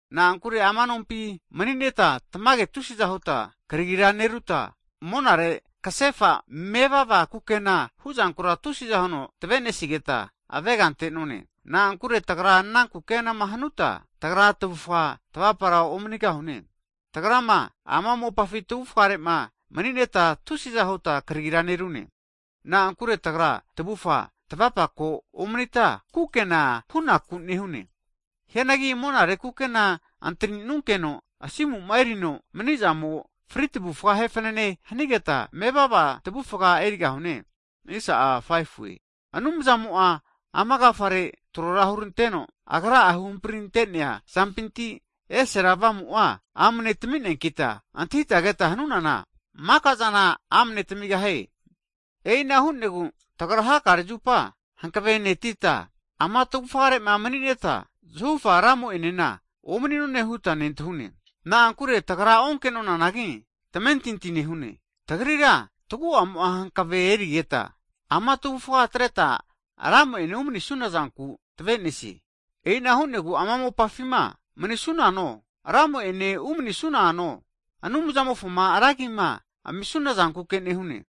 Na'ankure ama nompi (tavufga) mani'neta tamage tusiza huta kragira neruta, monare kasefa mevava kukena huzankura tusiza huno tavenesigeta, avega ante'none. Na'ankure tagra ana kukenama hanuta, tagra tavufga tavapara omanigahune. Tagrama ama mopafi tavufgare'ma mani'neta tusiza huta kragira nerunkeno kna tave'nesie. Na'akure tagra tavufa tavapako omanita kukena hunaku nehune. Hianagi monare kukena antaninunkeno asimuma erino manizamo fri tavufga ahe fanane hanigeta, mevava tavufga erigahune. Anumzamo'a ama agafare trohuranteno, Agra'a huhamprirante'nea zampinti esera Avamu'a amne tamineankita, antahita keta hanunana, makazana amne tamigahie. E'ina hu'negu tagra hakare zupa hanavenetita, ama tavufgare'ma mani'neta zahufa Ramo'enena omani'none huta nentahune. Na'ankure tagra onke'nonanagi, tamentinti nehune. Tagrira taguamo'a hankave e'nerigeta ama tavufga atreta Ramo'ene umanisuna zanku tave'nesie. E'ina hu'negu ama mopafima manisunano, Ramo ene umanisunano, Anumzamofoma ra agima amisunazankuke nehune.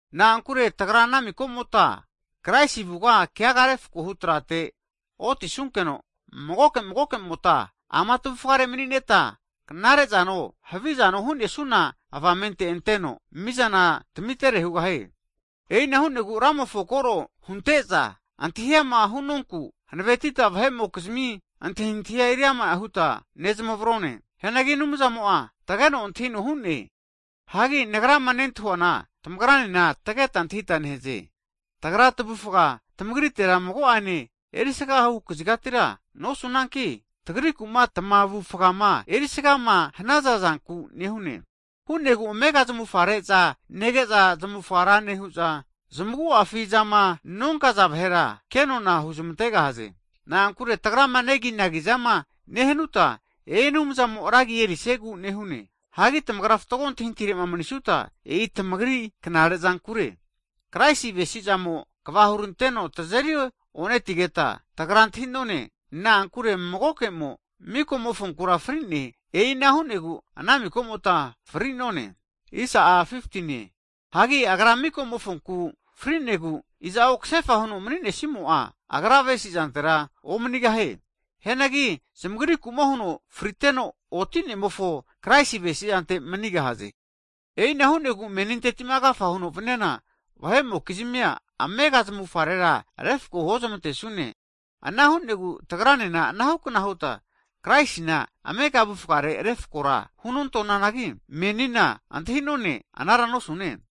Na'ankure tagra ana miko'mota Kraisi avuga keaga refkohu trate otisunkeno, magoke magokemota ama tavufgare mani'neta, knare'zano havizano hu'nesuna avamente anteno, mizana tamitere hugahie. E'ina hu'negu Ramofo'ma koro hunte'za antahi'ama hunonku, hanavetita vahe'mokizimi antahintahia eriama huta nezamavrone. Hianagi Anumzamo'a tageno antahino hu'ne. Hagi nagrama nentahuana tamagranena tageta antahita nehaze. Tagra'a tavufga tamagrite mago'ane erisagahu kazigatira nosunanki, tagriku'ma tamavufgama erisagama hanaza zanku nehune, hu'negu amega zamufare'ma nege'za zamavufga ra nehu'za, zamaguafizama nonkaza vahera, kenona huzmantegahaze. Na'ankure tagrama neginagizama nehanuta, e'i Anumzamo ragi erisiegu nehune. Hagi tagrama fatgo antahintahitirema manisuta, e'i tamagri knarezankure. Kraisi avesizamo tazeri onetigeta tagra antahi'none, na'ankure magokemo, miko'mofonku huno fri'ne. E'ina hu'negu ana miko'mota fri'none. Hagi Agra miko'mofonku fri'negu, iza'o kasefa huno maninesimo'a, agra'a vesizantera omanigahe. Hianagi zamagriku'ma huno fri'teno oti'nemofo Kraisi avesizante manigahaze. E'ina hu'negu menintetima agafa huno vaniana, vahe'mokizmia amega zamufgarera refko huozmantesune. Ana hu'negu tagranena anahukna huta Kraisina amega avufgare refakora hunte'nonanagi, menina antahi'none anara nosune.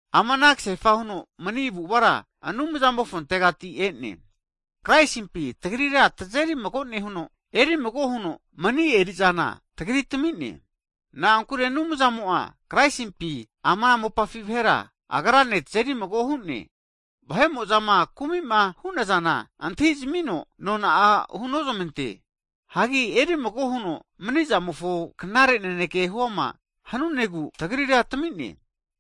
Ama ana kasefa huno mani avu'avara Anumzamofontegati e'ne. Kraisimpina tagrira tazeri mago nehuno, erimago huno mani eri'zana tagritami'ne. Na'ankure Anumzamo'a Kraisimpi ama mopafi vahera, Agrane tazeri mago hu'ne, vahe'mo'zama kumi'ma hu'nazana antahizmino nona hunozmante. Hagi erimago huno manizamofo knare naneke huama hanunegu, tagrira tami'ne.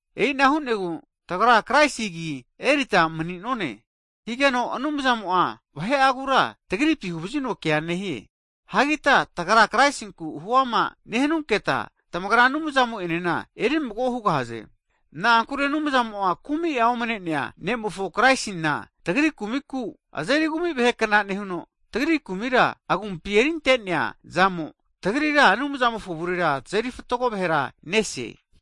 E'ina hu'negu tagra Kraisi agi erita mani'none. Higeno Anumzamo'a vahe'agura tagripi huvazino kea nehie. Ana huta tagra Kraisinku huama nehanunketa tamagra Anumzamo'enena erimago hugahaze. Na'ankure Anumzamo'a kumi'a omane'nea ne'mofo Kraisina tagri kumiku, azeri kumi vahekna nehuno, tagri kumira Agumpi erinte'nea zamo, tagrira Anumzamofo avure tazeri fatgo vahera nese.